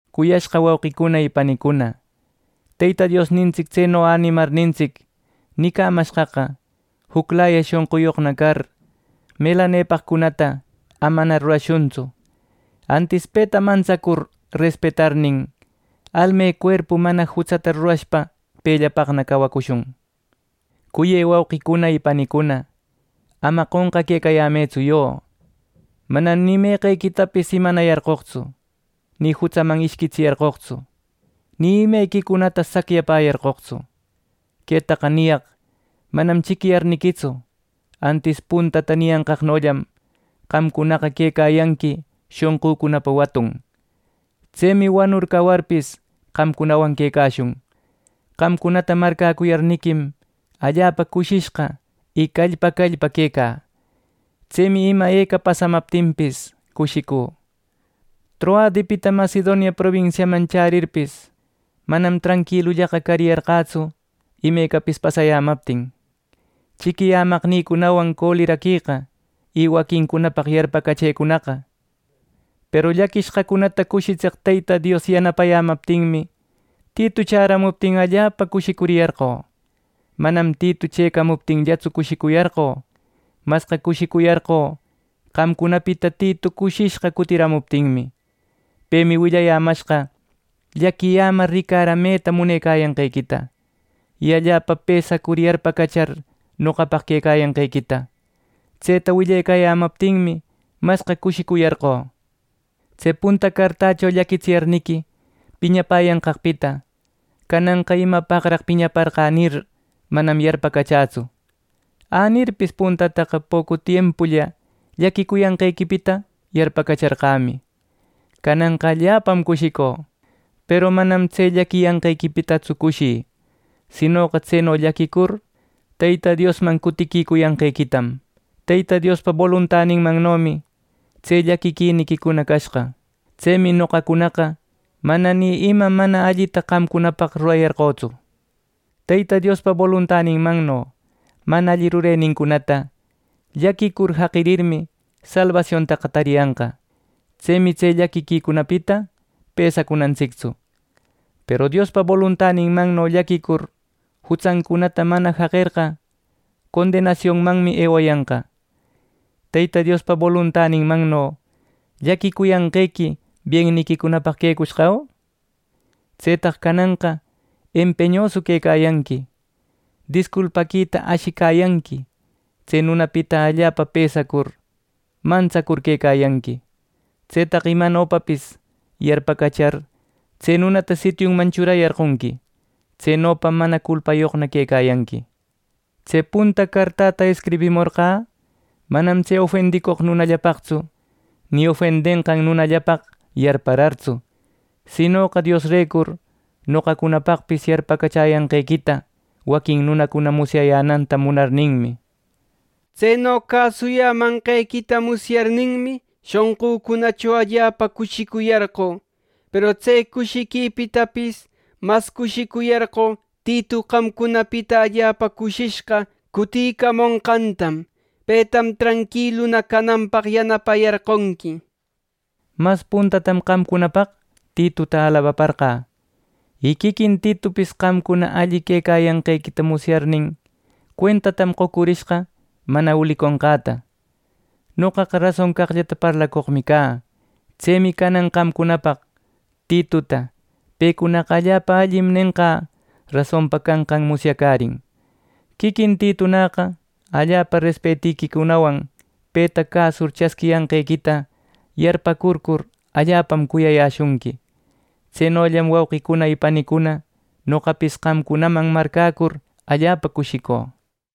Cuyashqa wauqicuna y panicuna, Teyta Diosnintsic tseno änimarnintsic nicamashqaqa juclaya shonquyoqna car, melanepaqcunata amana rurashuntsu, antis peta mantsacur respetarnin, almecuerpu mana jutsata rurashpa pellapaqna cawacushun. Cuyë wauqicuna y panicuna, ama qonqaquecayämëtsu yo, manam ni meqequitapis imanayarqoqtsu, ni jutsaman ishquitsiyarqoqtsu, ni imequicunata sacyayarqoqtsu. Quetaqa niyaq manam chiquiyarniquitsu, antis puntata niyanqaqnollam qamcunaqa quecayanqui shonqücunapa watun. Tsemi wanur cawarpis qamcunawan quecashun. Qamcunata marcäcuyarniquim, allapa cushishqa y callpa callpa quecä. Tsemi ima eca pasamaptinpis, cushicü. Troadepita Macedonia probinsiaman chärirpis, manam tranquilullaqa cariyarqätsu, imecapis pasayämaptin. ¡Chiquiyämaqnïcunawan coleraqueqa, y waquincunapaq yarpacachëcunaqa! Peru llaquishqacunata cushitseq Teyta Dios yanapayämaptinmi, Titu chäramuptin allapa cushicuriyarqö. Manam Titu chëcamuptinllatsu cushicuyarqö. Masqa cushicuyarqö qamcunapita Titu cushishqa cutiramuptinmi. Pemi willayämashqa llaquiyämar ricarameta munecayanqequita y allapa pesacur yarpacachar noqapaq quecayanqequita. Tseta willecayämaptinmi masqa cushicuyarqö. Tse punta cartächo llaquitsiyarniqui piñapäyanqaqpita cananqa “¿Imapaqraq piñaparqä?” nir, manam yarpacachätsu. Änirpis, puntataqa pocu tiempulla llaquicuyanqequipita yarpacacharqämi. Cananqa allapam cushicü, peru manam tse llaquiyanqequitatsu cushï; sinoqa tseno llaquicur, Teyta Diosman cutiquicuyanqequitam. Teyta Diospa boluntaninmannomi tse llaquiquiniquicuna cashqa. Tsemi noqacunaqa mana ni ima mana allita qamcunapaq rurayarqötsu. Teyta Diospa boluntaninmanno mana alli rurenincunata llaquicur jaqirirmi salbasiontaqa tariyanqa. Tsemi tse llaquiquicunapita pesacunantsictsu. Peru Diospa boluntaninmanno llaquicur jutsancunata mana jaqerqa condenasiunmanmi ewayanqa. Teyta Diospa boluntaninmanno llaquicuyanqequi bienniquicunapaq quecushqa, ¿au? Tsetaq cananqa empeñu quecayanqui, disculpaquita ashicayanqui, tse nunapita allapa pesacur, mantsacur quecayanqui. Tsetaq imanopapis yarpacachar, tse nunata sitiunman churayarqonqui. Tsenopam mana culpayoqna quecayanqui. Tse punta cartäta escribimorqä manam tse ofendicoq nunallapaqtsu, ni ofendenqan nunallapaq yarparartsu; sinoqa Diosrecur noqacunapaqpis yarpacachäyanqequita waquin nunacuna musyayänanta munarninmi. Tseno cäsuyämanqequita musyarirmi, shonqücunacho allapa cushicuyarqö. Peru tse cushiquipitapis masqa cushiquicuyarqö Titu qamcunapita allapa cushishqa cuticamonqantam. Petam tranquiluna cananpaq yanapayarqonqui. Mas puntatam qamcunapaq Tituta alabaparqä; y quiquin Titupis qamcuna alli cayanqequita musyarirnin, cuentatam qocurishqa mana uliconqäta. Noqaqa rason caqllata parlacoqmi cä. Tsemi canan qamcunapaq Tituta “Pecunaqa allapa allim” nenqä, rasonpa canqan musyacärin. Quiquin Titunäqa allapa respetiquicunawan peta cäsur chasquiyanqequita yarparcur, allapam cuyayäshunqui. Tsenollam wauqicuna y panicuna, noqapis qamcunaman marcäcur allapa cushicü.